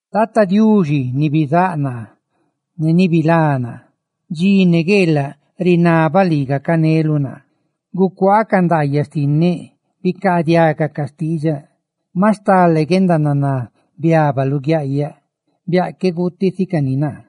Tata Diuxi ni bizáꞌ naa ne ni bilá naa, dxi ne gueelaꞌ rinabaꞌ lii gacaneluꞌ naa, ¡gucuaa ca nadaayaꞌ xtinneꞌ!, ¡bicaadiaga ca xtiidxaꞌ! Maꞌ stale guendananá biaba luguiaꞌyaꞌ, biaꞌ que guuti si cani naa;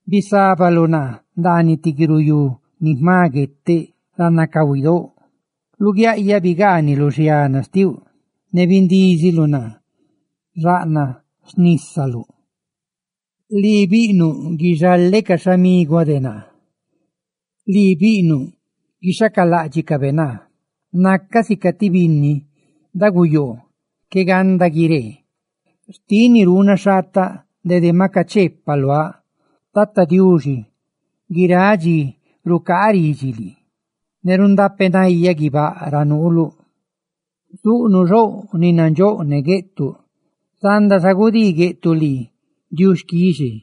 Bisábaluꞌ naa ndaaniꞌ ti guiruyú ni jma gueteꞌ, ra nacahuidóꞌ. Luguiaꞌyaꞌ bigaaniluꞌ xiana xtiuꞌ, ¡ne bindíziluꞌ naa xaꞌnaꞌ xnísaluꞌ! Lii biꞌnuꞌ guixaleꞌ ca xhamiguáꞌ de naa; lii biꞌnuꞌ guixhacaláꞌdxicabe naa. ¡Nacaꞌ sica ti binni daguyoo qué ganda guiree! Xtiꞌ ni ruunaꞌ xhaata dede ma cacheepaꞌ luaꞌ. ¡Tata Diuxi, guiráꞌ dxi rucaa ridxi lii, ne rundapeꞌ nayaꞌ guibáꞌ ra nuuluꞌ! Zuꞌnuꞌ xouꞌ ni nandxóꞌ ne gueꞌtuꞌ. Zanda xa gudii gueꞌtuꞌ lii diuxquixe.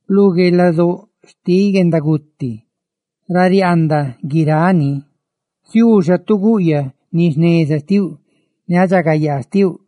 Lu gueelaꞌ cahuidóꞌ xtiꞌ guendaguti, ra riaandaꞌ guiráꞌ xixé, ziuu xa tu guꞌyaꞌ guendaruni jneza ne guendaridxagayaa xtiuꞌ.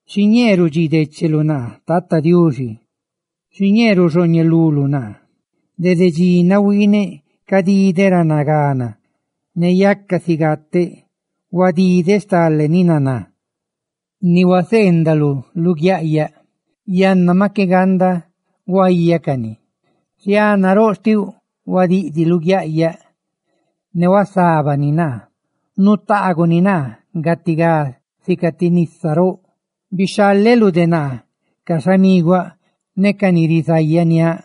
Xiñee rudxii décheluꞌ naa Tata Diuxi. Xiñee ruxhooñeluluꞌ de naa. Dede dxi nahuiineꞌ cadideꞌ ra nagana ne yaca si gateꞌ; huadideꞌ stale ni naná ni huaseendaluꞌ luguiaꞌyaꞌ, yanna maꞌ qué ganda guayaꞌ cani. Xiana roꞌ xtiuꞌ huadiꞌdiꞌ luguiaꞌyaꞌ, ne huasábani naa; nutaaguꞌ ni naa gatigá, sica ti nisa roꞌ. Bixhaleluꞌ de naa ca xhamiguaꞌ ne ca ni rizayaniáꞌ,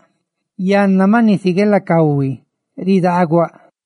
yanna maꞌ nisi gueelaꞌ cahui ridaaguaꞌ.